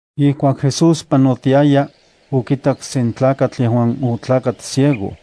Ijkuak Jesús panotiaya, okitak sen tlakatl yejuan otlakat ciego.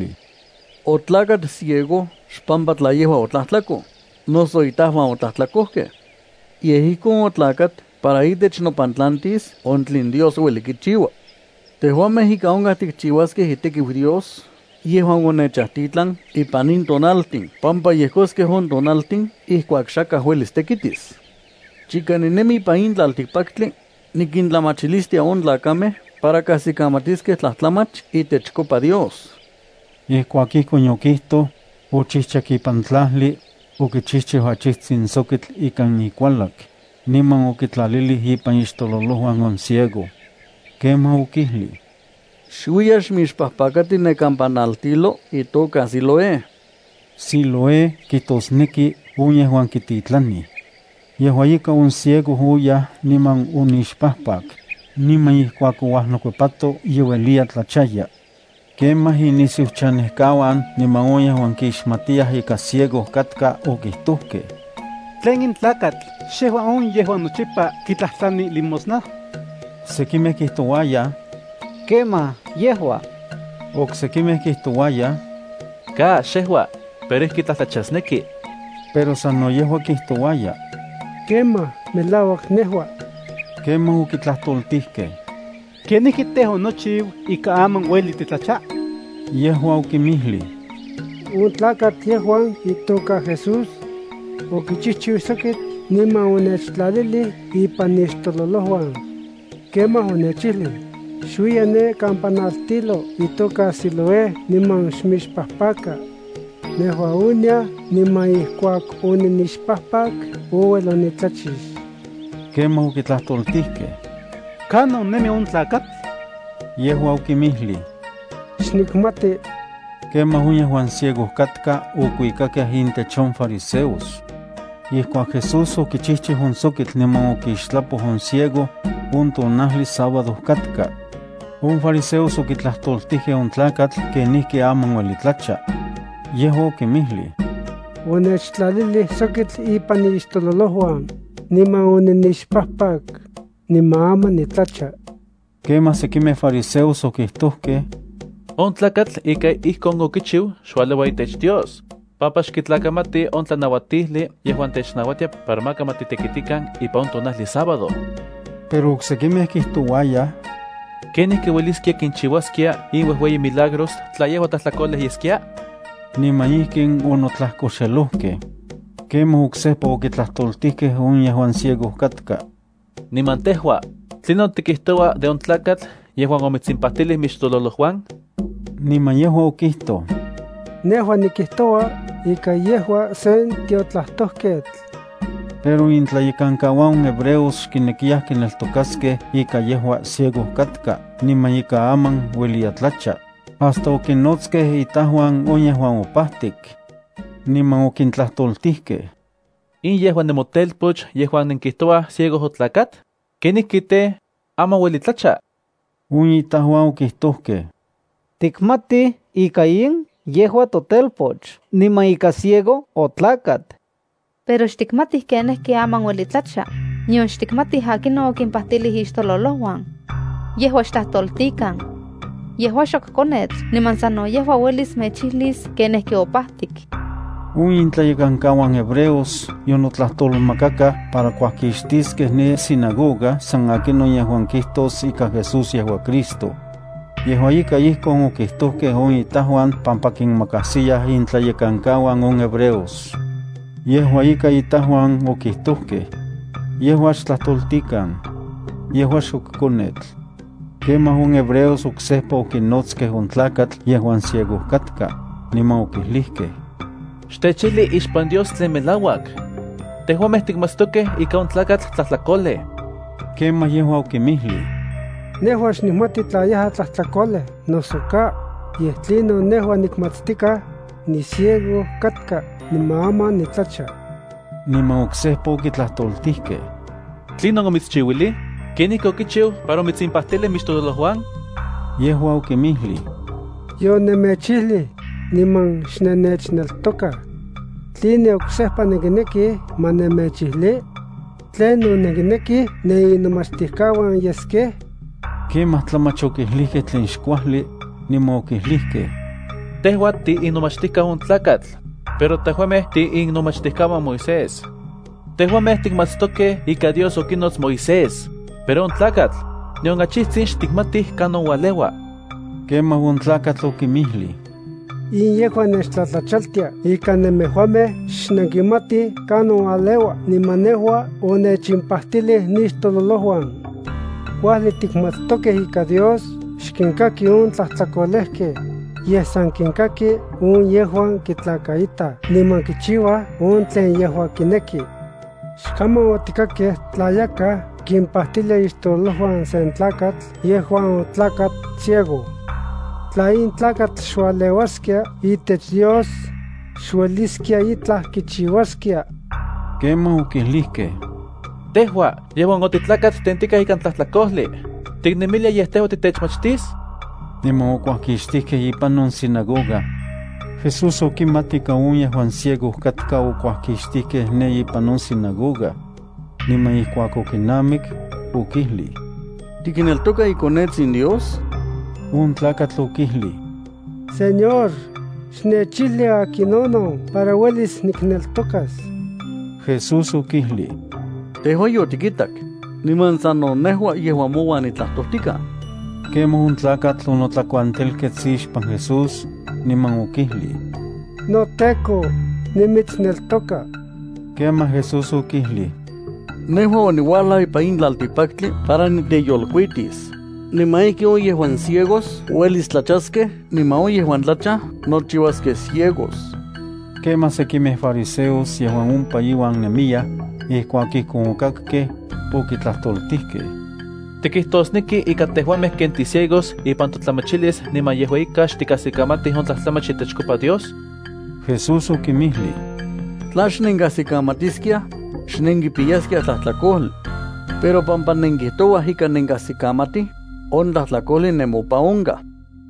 Jesús okinmijlij: —Otlakat ciego xpampa tla yejua otlajtlakoj, noso itajuan otlajtlakojkej. Yej ijkon otlakat para itech nopantlantis on tlen Dios ueli kichiua. Tejuamej ijka onkaj tikchiuaskej itekiu Dios yejuan onechajtitlan ipan in tonaltin pampa yejkoskej on tonaltin ijkuak xakaj uelis tekitis. Chika ninemi ipan in tlaltikpaktli, nikintlamachilistia on tlakamej para kajsikamatiskej tlajtlamach itechkopa Dios. Ijkuak ijkon yokijtoj, ochijchak ipan tlajli, okichijchiu achijtsin sokitl ikan ikualak, niman okitlalilij ipan ixtololojuan on ciego. Kemaj okijlij: —Xuiya xmixpajpakati ne kampa naltilo itoka Siloé. (Siloé kijtosneki “on yejuan kititlanij.”) Yejua ika on ciego oyaj niman onixpajpak, niman ijkuak ouajnokuepato ye ueliya tlachaya. Kemaj inisiuchanejkauan niman on yejuan kixmatiyaj ika ciego katka okijtojkej: —¿Tlen in tlakatl xejua on yejuan nochipa kitlajtlani limosna? Sekimej kijtouayaj: —Kemaj, yejua. Oksekimej kijtouayaj: —Ka, xejua, pero ijki tlajtlachasneki. Pero sano yejua kijtouaya: —Kemaj, melauak nejua. Kemaj okitlajtoltijkej: —¿Kenijki tej, onochiu ika aman ueli titlacha? Yejua okinmijlij: —On tlakatl yejuan itoka Jesús, okichijchiu sokitl niman onechtlalilij ipan nixtololojuan. Kemaj onechijlij: “Xuiya ne kampa naltilo itoka Siloé niman xmixpajpaka.” Nejua oniaj niman ijkuak oninixpajpak, ouel onitlachix. Kemaj okitlajtoltijkej: —¿Kanon nemi on tlakatl? Yejua okinmijlij: —Xnikmati. Kemaj on yejuan ciego katka okuikakej intech on fariseos. Ijkuak Jesús okichijchiu on sokitl niman okixtlapoj on ciego, on tonajli sábado katka. On fariseos okitlajtoltijkej on tlakatl kenijki aman ueli tlacha. Yejua okinmijlij: —Onechtlalilij sokitl ipan nixtololojuan, niman oninixpajpak, niman aman nitlacha. Kemaj sekimej fariseos okijtojkej: —On tlakatl ika ijkon okichiu xualeua itech Dios, pampa xkitlakamati on tlanauatijli yejuan technauatia para maka ma titekitikan ipan on tonajli sábado. Pero oksekimej kijtouayaj: —¿Kenijki ueliskia kinchiuaskia in uejueyi milagros tla yejua tlajtlakolej yeskia? Niman ijkin onotlajkoxelojkej. Kemaj oksejpa okitlajtoltijkej on yejuan ciego katka: —Niman tejua, ¿tlinon tikijtoua de on tlakatl yejuan omitsimpajtilij mixtololojuan? Niman yejua okijtoj: —Nejua nikijtoua ika yejua sen tiotlajtojketl. Pero intlayekankauan on hebreos xkinekiyaj kineltokaskej ika yejua ciego katka niman ika aman ueliya tlacha, hasta okinnotskej itajuan on yejuan opajtik, niman okintlajtoltijkej: —¿In yejua nemotelpoch yejuan nenkijtouaj ciego otlakat? ¿Kenijki tej, aman ueli tlacha? On itajuan okijtojkej: —Tikmatij ika in yejua totelpoch niman ika ciego otlakat. Pero xtikmatij kenijki aman ueli tlacha, nion xtikmatij akinon okimpajtilij ixtololojuan. Yejua xtlajtoltikan. Yejua xok konetl niman sano yejua uelis mechijlis kenijki opajtik. On intlayekankauan hebreos yonotlajtolmakakaj para kuajkixtiskej ne sinagoga san akinon yejuan kijtos ika Jesús yejua Cristo. Yejua ika, ijkon okijtojkej on itajuan pampa kinmakajsiyaj itlayekankauan on hebreos. Yejua ika itajuan okijtojkej: “Yejua xtlajtoltikan. Yejua xok konetl.” Kemaj on hebreos oksejpa okinotskej on tlakatl yejuan ciego katka, niman okijlijkej: —Xtechijli ixpan Dios tlen melauak. Tejuamej tikmatstokej ika on tlakatl tlajtlakolej. Ijkuakon yejua okinmijlij: —Nejua xnikmati tla yejua tlajtlakolej noso ka. Yej tlinon nejua nikmatstikaj, niciego katka niman aman nitlacha. Niman oksejpa okitlajtoltijkej: —¿Tlinon omitschiuilij? ¿Kenijki okichiu para omitsimpajtilij mixtololojuan? Yejua okinmijlij: —Yonemechijlij, niman xnennechneltokaj. ¿Tline oksejpa nenkinekij ma nemechijli? ¿Tlen no nenkinekij neninomachtijkauan yeskej? Kemaj tlamach okijlikej tlen xkuajli, niman okijlijkej: —Tejua tiinomachtijkau on tlakatl, pero tejuamej tiinnomachtijkauan Moisés. Tejuamej tikmatstokej ika Dios okinots Moisés, pero on tlakatl, nion achijtsin xtikmatij kanon ualeua. Kemaj on tlakatl okinmijlij: —¡In yejua nechtlatlachaltia ika nemejuamej xnenkimatij kanon ualeua niman nejua onechimpajtilij nixtololojuan! Kuajli tikmatstokej ika Dios xkinkaki on tlajtlakolejkej, yej san kinkaki on yejuan kitlakaitaj niman kichiuaj on tlen yejua kineki. Xkaman otikakej tla yakaj kimpajtilia ixtololojuan sen tlakatl yejuan otlakat ciego. Tla in tlakatl xualeuaskia itech Dios, xueliskia itlaj kichiuaskia. Kemaj okijlijkej: —Tejua yejuan otitlakat tentikaj ikan tlajtlakojli, ¿tiknemilia yej tejua titechmachtis? Niman okuajkixtijkej ipan on sinagoga. Jesús okimat ika on yejuan ciego katka okuajkixtijkej ne ipan on sinagoga. Niman ijkuak okinamik, okijlij: —¿Tikneltoka iKonetsin Dios? On tlakatl okijlij: —Señor, xnechijli akinonon para uelis nikneltokas. Jesús okijlij: —Tejua yotikitak, niman sano nejua yejuan mouan nitlajtojtikaj. Kemaj on tlakatl onotlakuantelkets ixpan Jesús, niman okijlij: —NoTEKO, nimitsneltoka. Kemaj Jesús okijlij: —Nejua oniuajlaj ipan in tlaltikpaktli para niteyolkuitis, niman ijkin on yejuan ciegos uelis tlachaskej niman on yejuan tlachaj nochiuaskej ciegos. Kemaj sekimej fariseos yejuan ompa iuan nemiyaj, ijkuak ijkon okakkej, okitlajtoltijkej: —¿Tikijtosneki ika tejuamej ken ticiegos ipan totlamachilis niman yejua ika xtikajsikamatij on tlajtlamach itechkopa Dios? Jesús okinmijlij: —Tla xnenkajsikamatiskiaj, xnenkipiyaskiaj tlajtlakojli. Pero pampa nenkijtouaj ika nenkajsikamatij, on tlajtlakojli nemopan onkaj.